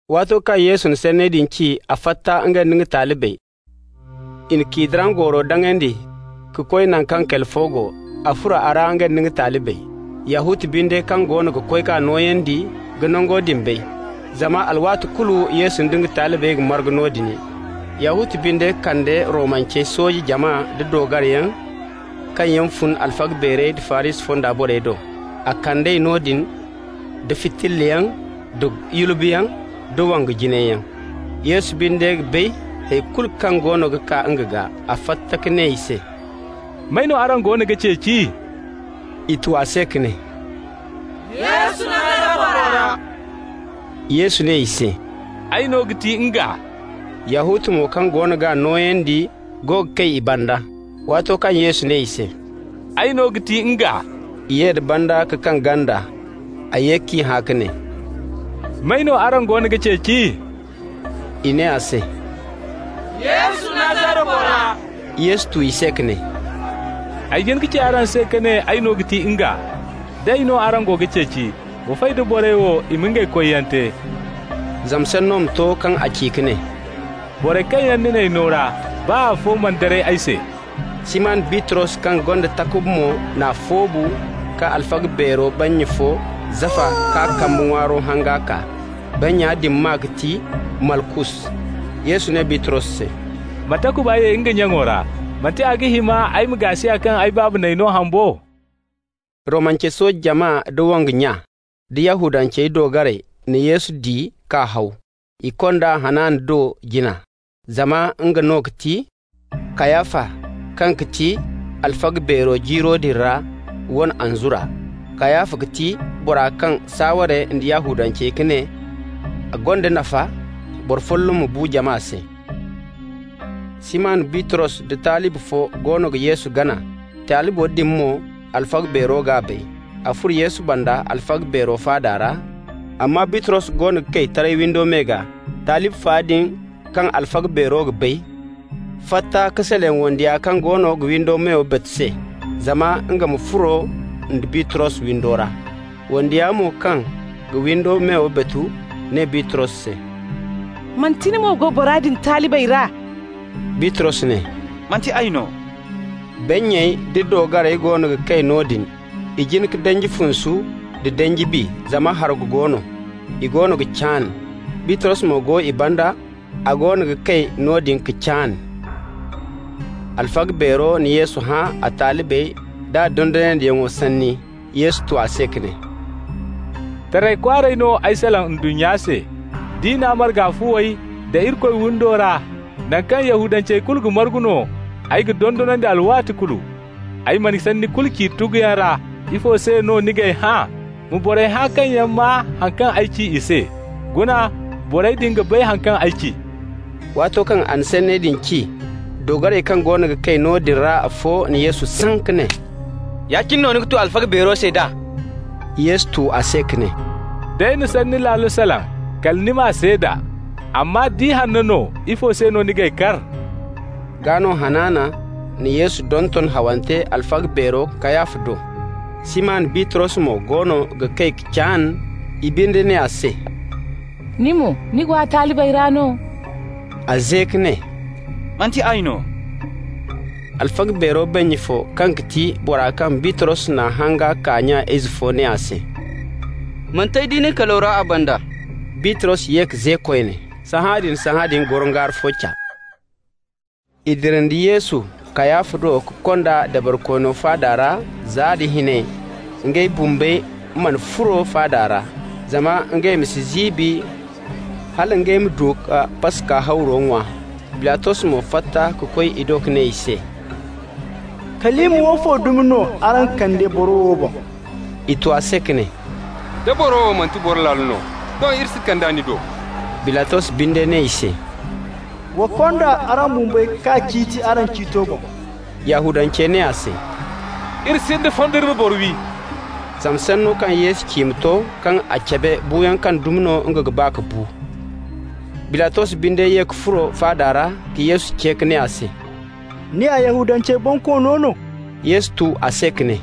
Waato kaŋ Yesu na sanney din ci, a fatta, nga nda nga talibey. I na Kidron gooro daŋandi ka koy naŋ kaŋ kali fo go. A furo a ra, nga nda nga talibey. Yahuta binde kaŋ goono ga koy k'a nooyandi ga nango din bay, zama alwaati kulu Yesu nda nga talibey ga margu noodin. Yahuta binde kande Romance sooje jama nda doogariyaŋ kaŋ yaŋ fun alfaga beerey da Farisi fonda borey do. A kand'ey noodin da fitillayaŋ da yulbeyaŋ da wongu jinayyaŋ. Yesu binde ga bay hay kulu kaŋ goono ga kaa nga gaa. A fatta ka ne i se: «May no araŋ goono ga ceeci?» I tu a se ka ne: «Yesu, Nazara bora.» Yesu ne i se: «Ay no ga ti NGA.» (Yahuta mo, kaŋ goono g'a nooyandi go ga kay i banda.) Waato kaŋ Yesu ne i se: «Ay no ga ti NGA,» i ye da banda ka kaŋ ganda. A ye k'i hã ka ne: «May no araŋ goono ga ceeci?» I ne a se: «Yesu, Nazara bora.» Yesu tu i se ka ne: «Ay jin ka ci araŋ se ka ne ay no ga ti NGA. D'ay no araŋ go ga ceeci, wa fay da borey wo, i ma ngey koyyaŋ te.» (Zama sanno ma to kaŋ a ci ka ne: «Borey kaŋ yaŋ ni n'ay no ra, baa afo mana daray ay se.») Siman Bitros kaŋ gonda takuba mo n'a foobu ka alfaga beero bannya fo zafa k'a kambe ŋwaari hanga kaa. Bannya din maa ga ti Malkus. Yesu ne Bitros se: «Ma takuba ye nga nyaŋo ra! Manti a ga hima ay ma gaasiya kaŋ ay Baaba n'ay no haŋ bo?» Romance sooje jama da wongu nya da Yahudancey doogarey na Yesu di ka haw. I kond'a Hanana do jina, zama nga no ga ti Kayafa, kaŋ ga ti alfaga beero jiiro din ra, wane anzura. Kayafa ga ti bora kaŋ saaware nda Yahudancey ka ne a gonda nafa boro folloŋ ma bu jama se. Siman Bitros da talibi fo goono ga Yesu gana. Talibo din mo, alfaga beero g'a bay. A furo Yesu banda alfaga beero faada ra. Amma Bitros goono ga kay taray windo me gaa. Talibi fa din kaŋ alfaga beero ga bay fatta ka salaŋ wandiya kaŋ goono ga windi meyo batu se zama nga ma furo nda Bitros windo ra. Wandiya mo kaŋ ga windi meyo batu ne Bitros se: «Manti ni mo go bora din talibey ra?» Bitros ne: «Manti ay no!» Bannyey da doogarey goono ga kay noodin. I jin ka danji funsu nda danji bi, zama hargu go no. I goono ga caan. Bitros mo go i banda, a goono ga kay noodin ka caan. Alfaga beero na Yesu hã a talibey da a dondonandiyaŋo sanni. Yesu tu a se ka ne: «Taray kwaaray no ay salaŋ ndunnya se. Diina marga fuwey da Irikoy windo ra, naŋ kaŋ Yahudancey kulu ga margu no, ay ga dondonandi alwaati kulu. Ay mana sanni kulu ci tuguyaŋ ra. Ifo se no ni g'ay hã? Ma borey hã kaŋ yaŋ maa haŋ kaŋ ay ci i se. Guna, borey din ga bay haŋ kaŋ ay ci.» Waato kaŋ a na sanney din ci, doogarey kaŋ goono ga kay noodin ra afo na Yesu saŋ ka ne: «Ya-cine no ni ga tu alfaga beero se d'a?» Yesu tu a se ka ne: «D'ay na sanni laalo salaŋ, kala ni m'a seeda, amma nda ihanno no, ifo se no ni g'ay kar?» Gaa no Hanana na Yesu donton hawante alfaga beero Kayafa do. Siman Bitros mo goono ga kay ka caan. I binde ne a se: «Ni mo ni go a talibey ra no?» A ze ka ne: «Manti ay no!» Alfaga beero bannya fo kaŋ ga ti bora kaŋ Bitros n'a hanga kaa nya-ize ne a se: «Manti ay di nin kalo ra a banda?» Bitros ye ka ze koyne. Sahãadin-sahãadin gorongaari fo ca. I dira nda Yesu Kayafa do ka kond'a dabarikoono faada ra za nda hinay. Ngey bumbey mana furo faada ra, zama ngey ma si ziibi, hala ngey ma du ka Paska hawro ŋwa. Bilatos mo fatta ka koy i do ka ne i se: «Kalima woofo dumi no araŋ kande boro wo boŋ?» I tu a se ka ne: «Da boro wo manti boro laalo no, doŋ iri si kand'a ni do.» Bilatos binde ne i se: «Wa konda araŋ bumbey k'a ciiti araŋ ciito boŋ.» Yahudancey ne a se: «Iri sinda fondo iri ma boro wi.» (Zama sanno kaŋ Yesu ci ma to, kaŋ a cabe buuyaŋ kaŋ dumi no nga ga ba ka bu.) Bilatos binde ye ka furo faada ra ka Yesu ce ka ne a se: «Ni ya Yahudancey bonkoono no?» Yesu tu a se ka ne: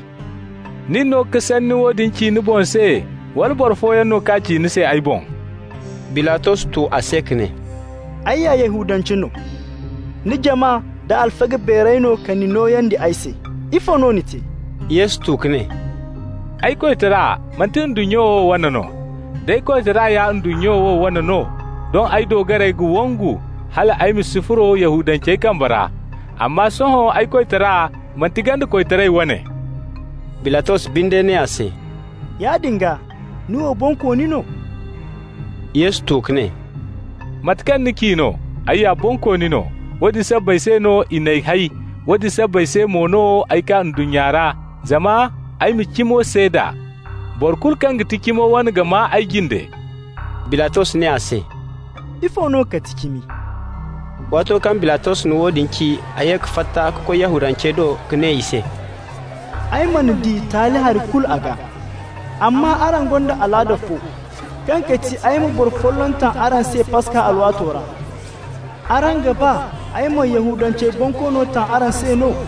«Nin no ka woodin ci ni boŋ se, wala boro fooyaŋ no k'a ci ni se ay boŋ?» Bilatos tu a se ka ne: «Ay ya Yahudance no? Ni jama da alfaga beerey no ka ni nooyandi ay se. Ifo no ni te?» Yesu tu ka ne: «Ay koytara manti ndunnya wo wane no. D'ay koytara ya ndunnya wo wane no, doŋ ay doogarey ga wongu, hal ay ma si furo Yahudancey kambe ra. Amma sohõ ay koytara manti ganda koytara wane.» Bilatos binde ne a se: «Yaadin gaa, ni wo bonkooni no?» Yesu tu ka ne: «Mate kaŋ ni ci no, ay ya bonkooni no. Woodin sabbay se no i n'ay hay, woodin sabbay se mo no ay kaa ndunnya ra, zama ay ma cimo seeda. Boro kulu kaŋ ga ti cimo wane ga maa ay jinde.» Bilatos ne a se: «Ifo no ga ti cimi?» Waato kaŋ Bilatos na woodin ci, a ye ka fatta ka koy Yahudancey do ka ne i se: «Ay mana di taali hari kulu a gaa. Amma araŋ gonda alaada fo kaŋ ga ti ay ma boro folloŋ taŋ araŋ se Paska alwaato ra. Araŋ ga ba ay ma Yahudancey bonkoono taŋ araŋ se no?»